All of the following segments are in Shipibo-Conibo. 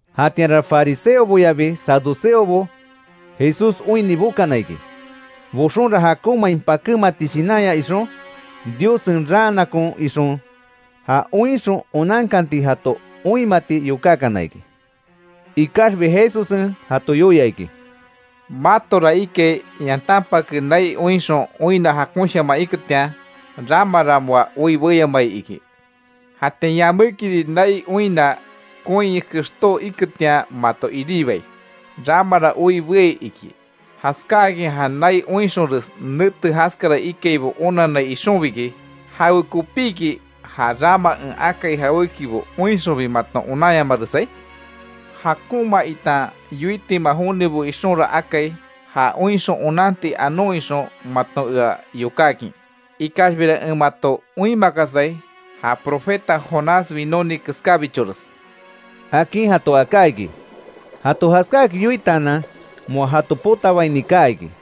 Jatianra, fariseoboyabi saduceobo Jesús oinni bokana iki. Boxonra, jakonmain pakémati shinanya ixon, Diossen raanakon ixon, ja oinxon onankanti jato oinmati yokákana iki. Ikaxbi Jesussen jato yoia iki: “Matora ikai yantanpake nai oinxon oinna jakonshaman iketian, ‘ramara moa oi beyamai iki’. Jatian yamékiri, nai oinna koin kextó iketian mato iribai, ‘ramara oi beai’, iki. Jaskáakin ja nai oinxonres, nete jaskara ikaibo onanai ixonbiki, ¿Jawekopíki, ja rama en akai jawékibo oinxonbi maton onanyamaresai? Jakonma itan yoitima jonibo ixonra akai ja oinxon onanti anon ixon maton ea yokákin. Ikaxbira en mato oinmakasai, ja profeta Jonás winóni keskábichores”, akin jato aká iki. Jato jaskáakin yoitaanan, moa jato potabaini kaa iki.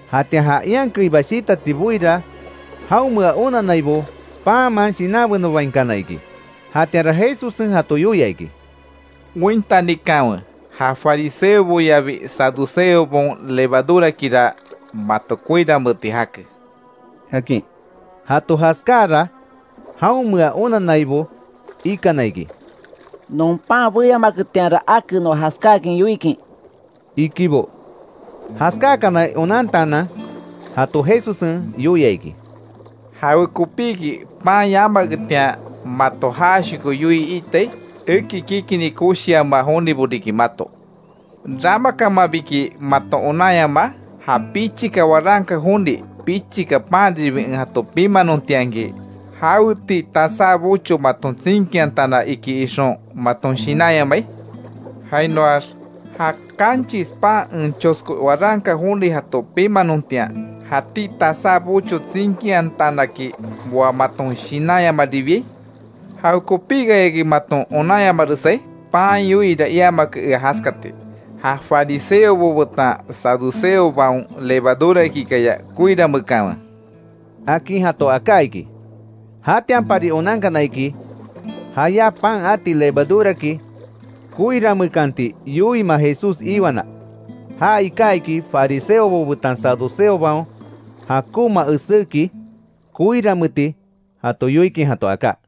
Jatian ja ian keiba shitati boira, jaonmea onannaibo panman shinanbenobainkana iki. Jatianra Jesussen jato yoia iki: —Ointanikanwe, ja fariseoboyabi saduceobaon, levadurakira mato koiranmeeti jake —akin. Jato jaskáakara, jaonmea onannaibo ikana iki: —Non pan beyamaketianra ake noa jaskáakin yoikin —ikibo. Jaskákanai onantaanan, jato Jesussen yoia iki: —¿Jawekopíki pan yamaketian, mato jashoko yoii iitai? Eki kikini koshiama jonibo riki mato. ¿Ramakamanbiki maton onanyamaa? ¿Ja pichika waranka joni, pichika panribi en jato pimanontianki, jaweti tasá bocho maton tsinkiantana iki ixon maton shinanyamai? Jainoax ¿Ja kanchis pan, en chosko waranka joni jato pimanontian, jatí tasá bocho tsinkiantanaki, moa maton shinanyamaribiai? ¿Jawekopíkayaki maton onanyamaresai? Pan yoiira iamake ea jaskati. Ja fariseobo betan saduceobaon levadurakikaya koirameekanwe —akin jato aká iki. Jatianpari onankana iki, jayá pan ati levaduraki koirameekanti yoiima Jesús iwana. Ja iká iki, fariseobo betan saduceobaon jakonma eséki koiranmeeti jato yoikin jato aká.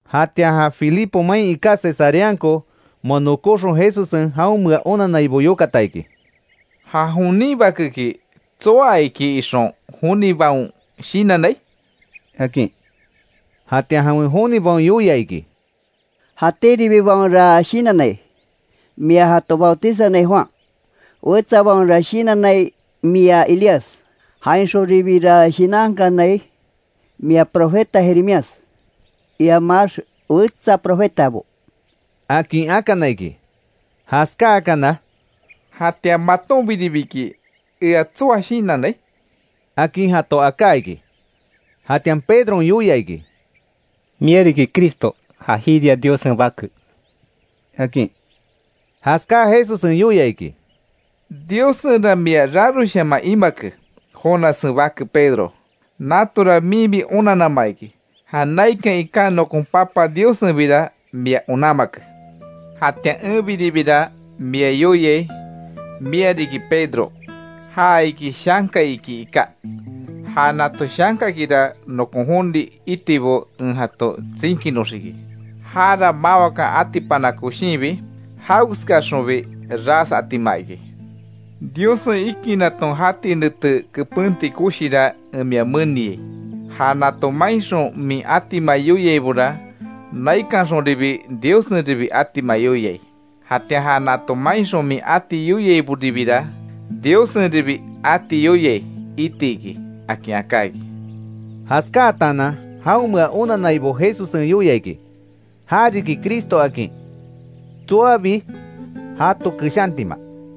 Jatian ja Filipo main iká Cesareanko moa nokóxon, Jesussen jaonmea onannaibo yokata iki: —¿Ja jonin Bakeki tsoa iki ixon jonibaon shinannai? —akin. Jatian jawen jonibaon yoia iki: —Jatíribibaonra shinannai, mia jato bautizanai Juan. Wetsabaonra shinannai, mia Elías. Jainxonribira shinankanai, mia profeta Jeremías, iamax wetsa profetabo —akin akana iki. Jaskáakana —¿Jatian matonbiribiki, ea tsoa shinannai? —akin jato aká iki. Jatian Pedron yoia iki: —Mia riki Cristo, ja jiria Diossen bake —akin. Jaskáa Jesussen yoia iki: —Diossenra mia raroshaman imake, Jonassen bake Pedro, natora minbi onanama iki. Ja naikan iká nokon Papa Diossenbira mia onanmake. Jatian enbiribira mia yoiai, mia riki Pedro; ja iki shanka iki iká. Ja nato shankakira nokon joni itibo en jato tsinkinoxiki. Jara mawakan atipana koshinbi, jawekeskaxonbi ras atima iki. Diossen ikinaton jati nete kepenti koshira en mia meniai. Ja nato mainxon min atima yoiaibora, naikanxonribi Diossenribi atima yoiai. Jatian ja nato mainxon min ati yoiaiboribira, Diossenribi ati yoiai itiki —akin aká iki. Jaskátaanan jaonmea onannaibo Jesussen yoia iki; ja riki Cristo akin tsoabi jato keshantima.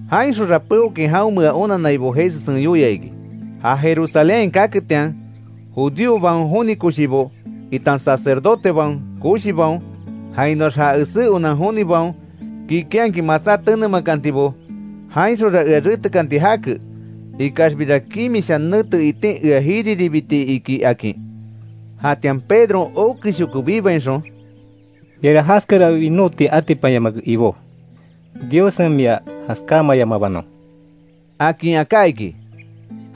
Jainxonra peokin jaonmea onannaibo Jesussen yoia iki, ja Jerusalénhain kaketian, judíobaon joni koshibo, itan sacerdotebaon koshibaon, jainoax ja esé onan jonibaon, kikinhakin masá tenemakantibo. Jainxonra ea retekanti jake, ikaxbira kimisha nete itin ea jiriribiti iki, akin. Jatianra Pedron okeshoko bibainxon: —Miara jaskara winóti atipanyamake Ibó; Diossen mia jaskámayamabanon —akin aká iki.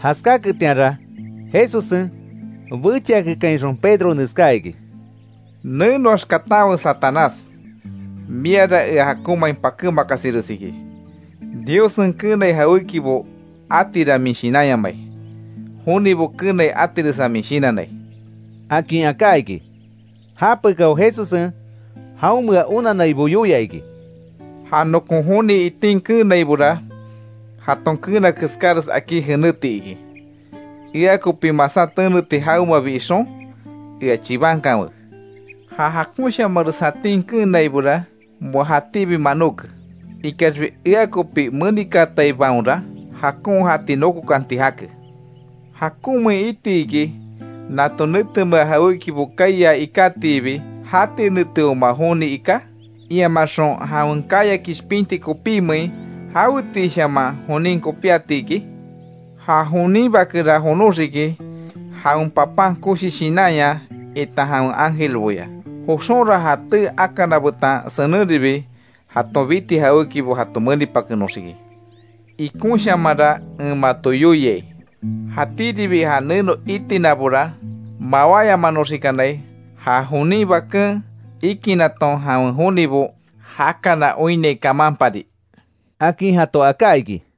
Jaskáketianra, Jesussen bechiakekainxon Pedro neskáa iki: —Nenoax katanwe Satanás. Miara ea jakonmain pakémakasires iki. Diossen keenai jawékibo atira min shinanyamai, jonibo keenai atiresa min shinannai —akin aká iki. Japekao, Jesussen jaonmea onannaibo yoia iki: —Ja nokon joni itin keenaibora, jaton keena keskáres akí jenéti iki. Ea kopi masá teneti jawemabi ixon, ea chibankanwe. Ja jakonshamares jatín keenaibora, moa jatíbi manóke. Ikaxbi, ea kopi menikaataibaonra, jakon jati nokokanti jake. ¿Jakonmein iti iki, nato netemea jawékibo kaiaa ikátiibi, jati neteoma joni iká? Iamaxon ¿Jawen kaya kishpinti kopímein, jawetiishaman jonin kopíatiki? Ja jonin Bakera jonoxiki, jawen Papan koshi shinanya itan jawen ángelboya. Joxonra ja tee akana betan senenribi jaton biti jawékibo jato menipakenoxiki. Ikonshamanra en mato yoiai, jatíribi ja neno itinabora mawáyamanoxikanai, ja jonin Baken ikinaton jawen jonibo jakana oinnai kamanpari —akin jato aká iki.